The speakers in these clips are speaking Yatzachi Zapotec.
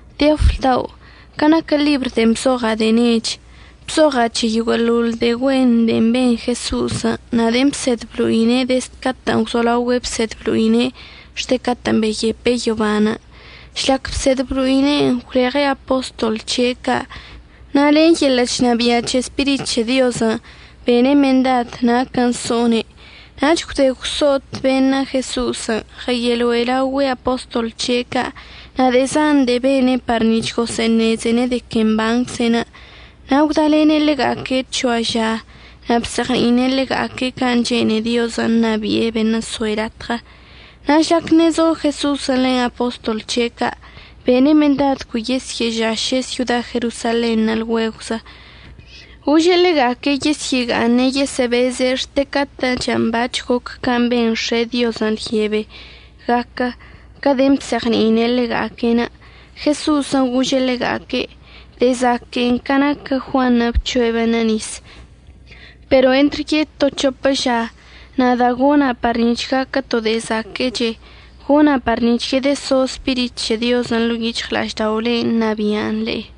Teofilo dao', ca' naquə ḻibr de'en bzoɉa' de'e nech, bzoɉa' c̱he yoguə'əḻoḻ de'e güen de'e ben Jeso'osən' na' de'en bsed blo'ine' dezd catə'ən gwzolaogüe' bsed blo'ine' xte catə'ən beyepe' yoban'. Žlac bsed blo'ine'enə' gwleɉe' apostol c̱he' ca' na' len yeḻə' chnabia' c̱he Spirit c̱he Diozən' bene' mendad naquən' so'one'. Nach gwde gwso'ot beṉə' Jeso'osən', ɉəyeloe' laogüe' apostol c̱he' ca'. Na' de'e zan de'e bene' par nic̱h gosə'əṉezene' de que mbancze'enə', na' gwdalene' ḻega'aque' c̱hoa ža na' bzeɉni'ine' ḻega'aque' can' chene'e Diozən' ṉabi'e beṉə' so'e latɉə. Na' žlac ṉe'e zo Jeso'osən' len apostol c̱he' ca' bene' mendad cui yesyə'əžaše' syoda Jerosalenṉə' lgüegwzə. Gože' ḻega'aque' yesyə'əga'aṉe' yesə'əbeze' xte catə'ən bac̱h goc can' ben X̱e' Diozən' lyebe gaquə, ca de'en bzeɉni'ine' ḻega'aque'. Jeso'osən' goze'e ḻega'aque': ―De'e zaque'enə' ca naquə Juanṉə' bc̱hoe' beṉə' nis, pero entr yeto c̱hopə ža, nada' gona' par nic̱h gaquə to de'e zaquə'əche, gona' par nic̱h yedəso Spirit c̱he Diozən' ḻo'o yic̱hɉla'ažda'olen' ṉabi'an le'e.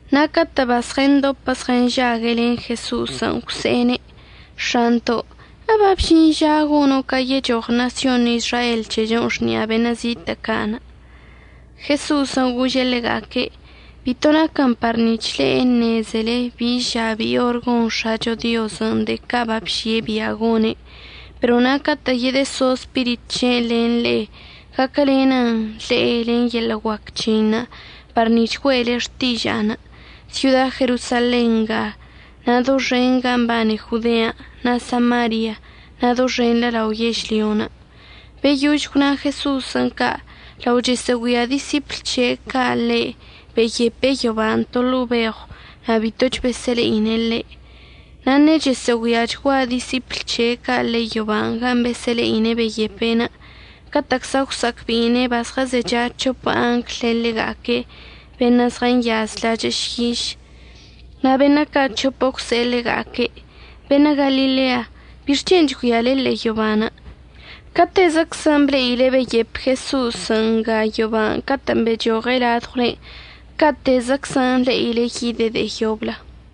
Na' catə' bazɉəndopə zɉənžague' len Jeso'osən' gwse'ene': ―X̱anto' ¿əbabžin ža gono' ca yechoɉ ṉasyon Izrael c̱hechon' xni'a beṉə' zitə' ca'? Jeso'osən' gože' ḻega'aque': ―Bito naquən par nic̱h le'e əṉezele bi ža bi orən' gon X̱acho Diozən' de'e ca' babži'e bia' gone'. Pero na' catə' yedəso Spirit c̱he'enə' len le'e, gaquəlenən le'e len yeḻə' guac c̱he'enə' par nic̱h güe'ele xtiža'anə' syoda Jerosalen nga, na' doxen ga mbane Jodean', na' Samarian' na' doxenḻə lao yežlyon'. Beyož gwna Jeso'osən' ca', lao chəsə'əgüia disipl c̱he' ca' ḻe' beyepe' yoban' to ḻo'o beɉw na' bitoch besə'əle'ine' ḻe'. Na' ṉe'e chəsə'əgüiachgua disipl c̱he' ca' ḻe'e yoban' gan' besə'əle'ine' beyepe', catə'əczla gwsa'acbe'ine' bazɉəzecha c̱hopə angl len ḻega'aque' beṉə' zɉənyaz lachə' šyiš. Na' beṉə' ca' c̱hopə gwse'e ḻega'aque': ―Beṉə' Galilea, ¿bixc̱hen' chgüiale ḻe'e yoban'? Catezəczən' ble'ile beyep Jeso'os nga yoban' catə'ən bechoɉe' ladɉwlen', ca'atezəczən' le'ile yide' de'e yoblə.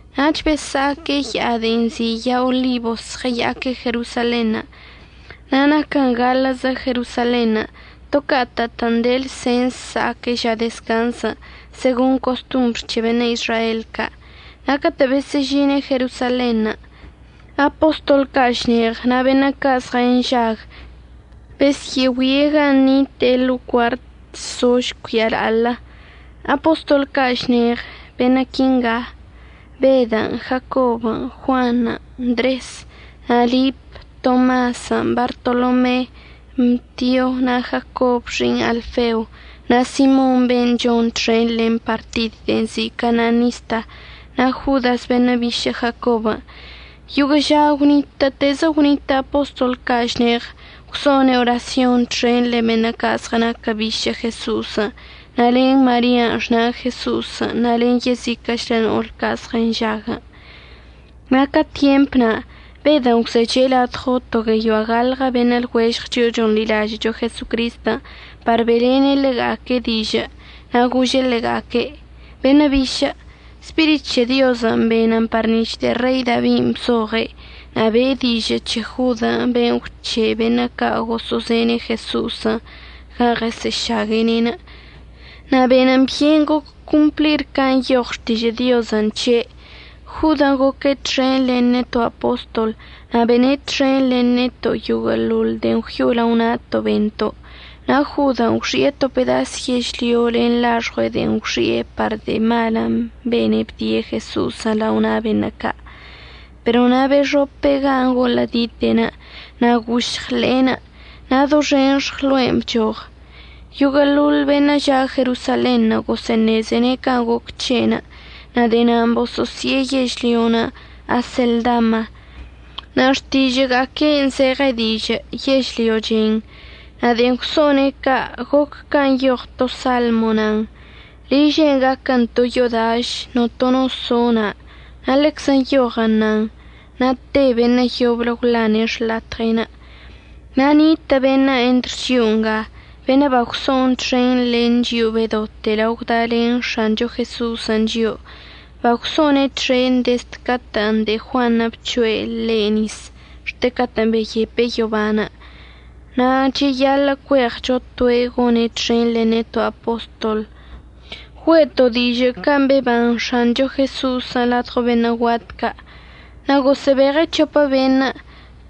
Nach besa'aque' ya'a de'en nzi' ya'a Olibos ɉəya'aque' Jerosalenṉə', na' naquə gaḻə'əzə Jerosalenṉə' to catə'ətə'ən de lsens sa'aque' ža dezcanzən' segon costombr c̱he beṉə' Izrael ca'. Na' catə' besə'əžine' Jerosalenṉə' apostol ca' šneɉ na' beṉə' ca' zɉənžague' besyə'əgüie' gan' nite'enə' ḻo'o cuartən' zo žcuia la'aḻə. Apostol ca' šneɉ beṉə' quinga: Bedən', Jacobən', Juanṉə', Ndresən', na' Lipən', Tomasən', Bartolomen', Mtion' na' Jacob xi'iṉ Alfeo, na' Simon ben' chon txen len partid de'en nzi' Cananista, na' Jodasən' beṉə' bišə' Jacobən'. Yoguə' ža gwnitə'ətezə gwnitə' apostol ca' šneɉ gwso'one' orasyon txen len beṉə' ca' zɉənaquə bišə' Jeso'osən' na' len Maria xna' Jeso'osən' na' len yeziquə'əchlə no'ol ca' zɉənžague'. Na' ca tyemp na' Bedən' gwzeche' ladɉo to gueyoa gaḻɉə beṉə' lɉuežɉ chio'o chonḻilažə'əcho Jesocristən' par be'elene' ḻega'aque' dižə'ən, na' gože' ḻega'aque': ―Beṉə' bišə', Spirit c̱he Diozən' benən par nic̱h de'e Rei Dabin' bzoɉe' na' be'e dižə' c̱he Jodən' ben' gwc̱he'e beṉə' ca' gosə'əzen Jeso'osən' gan' ɉesə'əšague'ene'. Na' benən byen goc complir can' nyoɉ Xtižə' Diozən' c̱he'. Jodən' goque' txen len neto' apostol, na' bene' txen len neto' yoguə'əḻoḻ de'en gwyo'o lao na'ato' bento'. Na' Jodən' gwxi'e to pedas yežlyo len laxɉue' de'en gwxi'e par de'e malən' bene' bdie' Jeso'osən' lao na' beṉə' ca'. Pero na' bexope' gan' golə'ədite'enə' na' gošɉ ḻe'enə' na' doxen xɉlo'enə' bchoɉ. Yoguə'əḻoḻ beṉə' ža' Jerosalenṉə' gosə'əṉezene' can' goc c̱he'enə' na' de'e na'anə' bosə'əsi'e yežlyon' Aseldama na' xtižə'əga'aque'enə' zeɉe dižə' yežlyo chen. Na' de'en gwso'one' ca' goc can' nyoɉ to Salmo nan: Liže'enə' gaquən to yo'o daš, notono no so' na'. Na' ḻeczə nyoɉən nan: Na' te beṉə' yoblə gwḻane' xḻatɉe'enə'. Na' nitə' beṉə' entr chio'o nga beṉə' bagwso'on txen len chio'o bedote lao gwdalen X̱ancho Jeso'osən' chio'o. Bagwso'one' txen dezd catə' de'e Juanṉə' bc̱hoe' ḻe' nis xte catə'ən beyepe' yoban', na' cheyaḻə' cueɉcho toe' gone' txen len neto' apostol güe'eto' dižə' can' beban X̱ancho Jeso'osən' ladɉo beṉə' guat ca'. Na' gosə'əbeɉe' c̱hopə beṉə',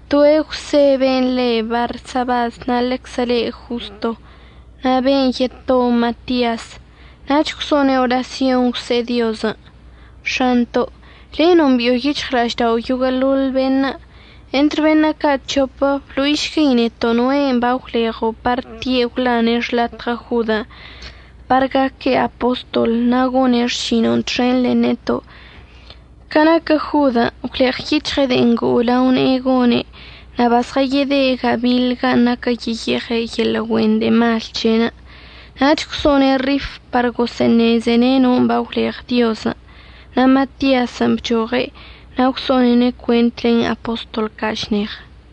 toe' Jwse ben' le Barsabas, na' ḻeczə le' Josto, na' ben' yeto Matias. Nach gwso'one' orasyon gwse'e Diozən': ―X̱anto' le' nombi'o yic̱hɉla'aždao' yoguə'əḻoḻ beṉə'. Entr beṉə' ca' c̱hopə blo'išguei neto' noe' bagwleɉo' par tie' gwḻane' xḻatɉə Jodən' par gaque' apostol na' gone' xšino'onə' txen len neto', ca naquə Jodən' gwleɉyic̱hɉe' de'en ngo'o lao ne'enə' gone' na' bazɉəyede' gabiḻ gan' naquən yeyeɉe' yeḻə' güen de'e mal c̱he'enə'. Nach gwso'one' rif par gosə'əṉezene' non' bagwleɉ Diozən' na' Matiasən' bchoɉe' na' gwso'onene' cuent len apostol ca' šneɉ.